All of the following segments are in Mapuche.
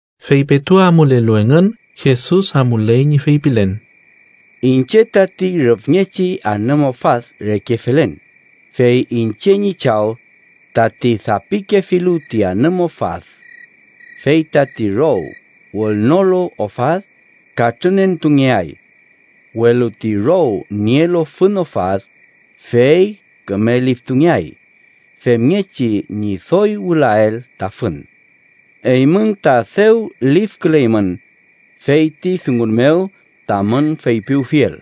Fey petu amulelu engün, Jesus amuley ñi feypilen: “Iñche tati rüfngechi anüm ofad reke felen, fey iñche ñi Chaw tati dapikefilu ti anüm ofad. Fey tati row wülnolu ofad, katrünentungeay. Welu ti row nielu fün ofad, fey küme liftungeay, femngechi ñi doy wülael ta fün. Eymün ta dew lifküleymün fey ti dungun mew tamün feypiwfiel.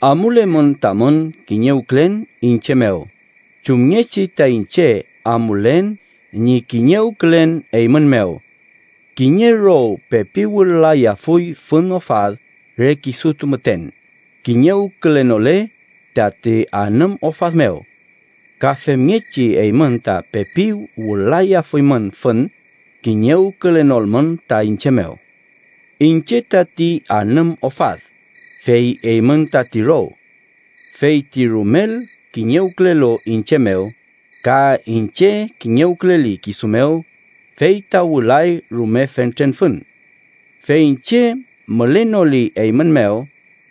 Amulemün tamün kiñewkülen iñche mew, chumngechi ta iñche amulen ñi kiñewkülen eymün mew. Kiñe row pepi wül-layafuy fün ofad re kisutu müten, kiñewkülenole tati anüm ofad mew. Ka femngechi, eymün ta pepi wül-layafuymün fün, kiñewkülenolmün ta iñche mew. “Iñche tati anüm ofad, fey eymün tati row. Fey ti rumel kiñewkülelu iñche mew, ka iñche kiñewküleli kisu mew, fey ta wülay rume fentren fün. Fey iñche mülenoli eymün mew,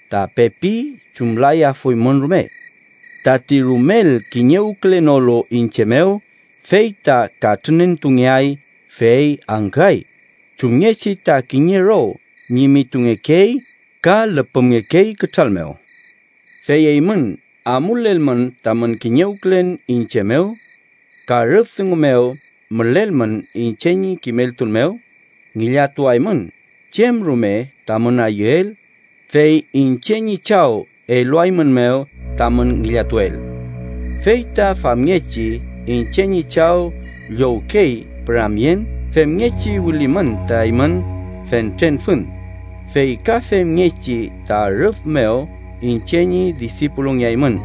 ta pepi chumlayafuymün rume. Tati rumel kiñewkülenolu iñche mew, fey ta katrünentungeay, fey angküay chumngechi ta kiñe row ñimitungekey ka lüpümngekey kütral mew. “Fey eymün amulelmün tamün kiñewkülen iñche mew ka rüf dungu mew mülelmün iñche ñi kimeltun mew, ngillatuaymün chem rume tamün ayüel, fey iñche ñi Chaw eluaeymünmew tamün ngillatuel. Fey ta famngechi iñche ñi Chaw llowkey püramyen femngechi wülimün ta eymün fentren fün, fey ka femngechi ta rüf mew iñche ñi disipulungeaymün.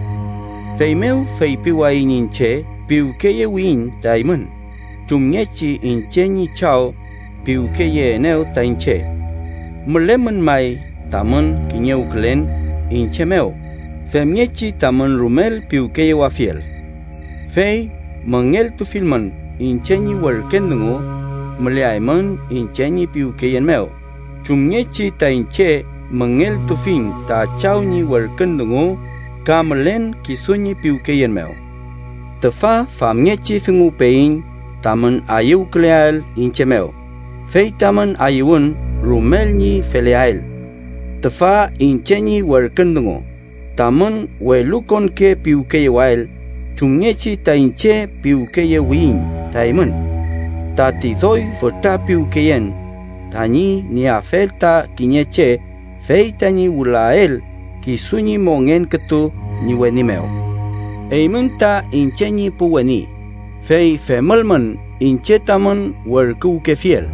Feymew feypiwayiñ iñche piwkeyewiyiñ ta eymün chumngechi iñche ñi Chaw piwkeyeenew ta iñche. Mülemün may tamün kiñewkülen iñche mew femngechi tamün rumel piwkeyewafiel. Fey müngeltufilmün iñche ñi werkün dungu, müleaymün iñche ñi piwkeyen mew, chumngechi ta iñche müngeltufiñ ta Chaw ñi werkün dungu ka mülen kisu ñi piwkeyen mew. “Tüfa famngechi dunguwpeyiñ tamün ayüwküleael iñche mew, fey tamün ayüwün rumel ñi feleael. Tüfa iñche ñi werkün dungu: Tamün welukonke piwkeyewael chumngechi ta iñche piwkeyewiyiñ ta eymün. Tati doy fütra piwkeyen tañi nieafel ta kiñe che fey tañi wülael kisu ñi mongen kütu ñi weni mew. Eymün ta iñche ñi pu weni, fey femülmün iñche tamün werküwkefiel.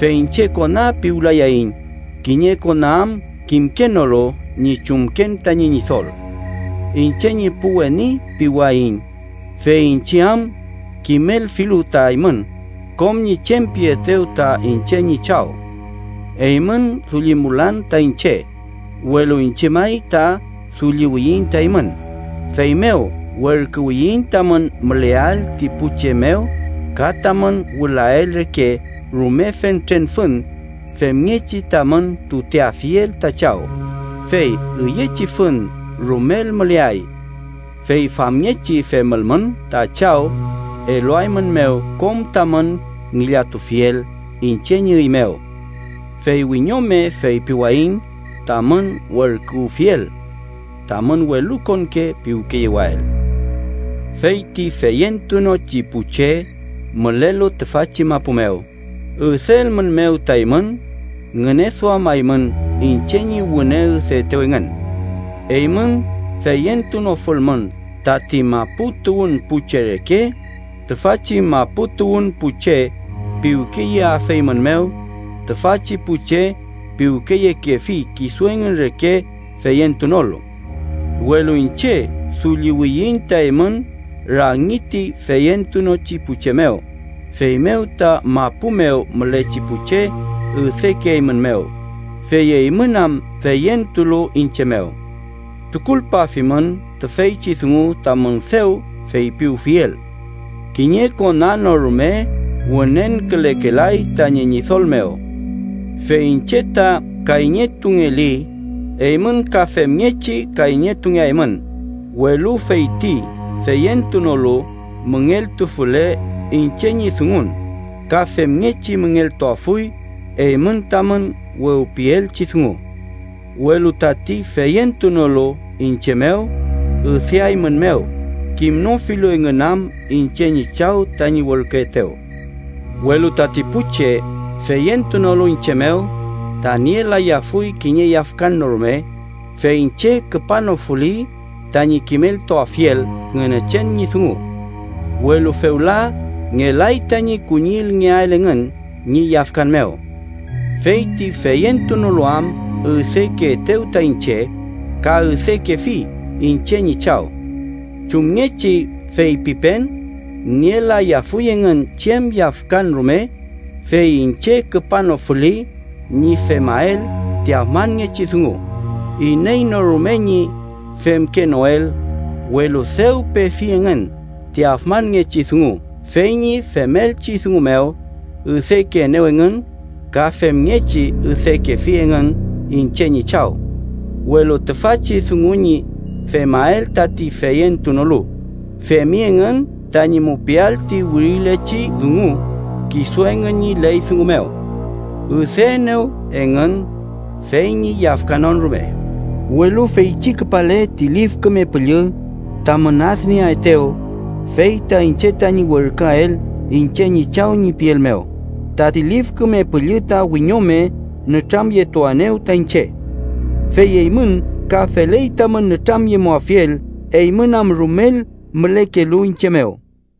Fey iñche kona piwlayayiñ, kiñe kona am kimkenolu ñi chumken tañi ñidol. Iñche ñi pu weni piwayiñ, fey iñche am kimelfilu ta eymün kom ñi chem pietew ta iñche ñi Chaw. Eymün dullimulan ta iñche, welu iñche may ta dulliwiyiñ ta eymün, feymew werküwiyiñ tamün müleael ti pu che mew ka tamün wülael reke rume fentren fün femngechi tamün tuteafiel ta Chaw, fey üyechi fün rumel müleay. Fey famngechi femülmün, ta Chaw eluaeymünmew kom tamün ngillatufiel iñche ñi üy mew. Fey wiñome feypiwayiñ tamün werküwfiel: tamün welukonke piwkeyewael. “Fey ti feyentunochi pu che mülelu tüfachi mapu mew üdeelmünmew ta eymün, ngüneduamaymün iñche ñi wüne üdeetew engün. Eymün feyentunofulmün tati mapu tuwün pu che reke, tüfachi mapu tuwün pu che piwkeyeafeymünmew, tüfachi pu che piwkeyekefi kisu engün reke feyentunolu. Welu iñche dulliwiyiñ ta eymün rangi ti feyentunochi pu che mew, feymew ta mapu mew mülechi pu che üdekeeymünmew, fey eymün am feyentulu iñche mew. Tukulpafimün tüfeychi dungu tamün dew feypiwfiel: ‘Kiñe kona no rume wünenkülekelay tañi ñidol mew.’ Fey iñche ta kayñetungeli, eymün ka femngechi kayñetungeaymün, welu feyti feyentunolu müngeltufule iñche ñi dungun, ka femngechi müngeltuafuy eymün tamün wewpielchi dungu. Welu tati feyentunolu iñche mew, üdeaeymünmew, kimnofilu engün am iñche ñi Chaw, tañi werküetew. “Welu tati pu che feyentunolu iñche mew, ta nielayafuy kiñe yafkan no rume, fey iñche küpanofuli tañi kimeltuafiel Ngünechen ñi dungu. Welu fewla ngelay tañi kuñillngeael engün ñi yafkan mew. Fey ti feyentunolu am üdekeetew ta iñche, ka üdekefi iñche ñi Chaw. Chumngechi feypipen, nielayafuy engün chem yafkan rume, fey iñche küpanofuli ñi femael ti afmanngechi dungu iney no rume ñi femkenoel, welu dew pefi engün ti afmanngechi dungu, fey ñi femelchi dungu mew, üdekeenew engün ka femngechi üdekefi engün iñche ñi Chaw. Welu tüfachi dungu ñi femael tati feyentunolu, femi engün tañi mupiael ti wirilechi dungu kisu engün ñi ley dungu mew: ‘Üdeenew engün, fey ñi yafkanon rume.’ “Welu feychi küpale ti Lif Küme Püllü, tamün adnieaetew, fey ta iñche tañi werküael iñche ñi Chaw ñi piel mew, tati Lif Küme Püllü ta wiñome nütramyetuaenew ta iñche. Fey eymün ka feley tamün nütramyemuafiel, eymün am rumel mülekelu iñche mew.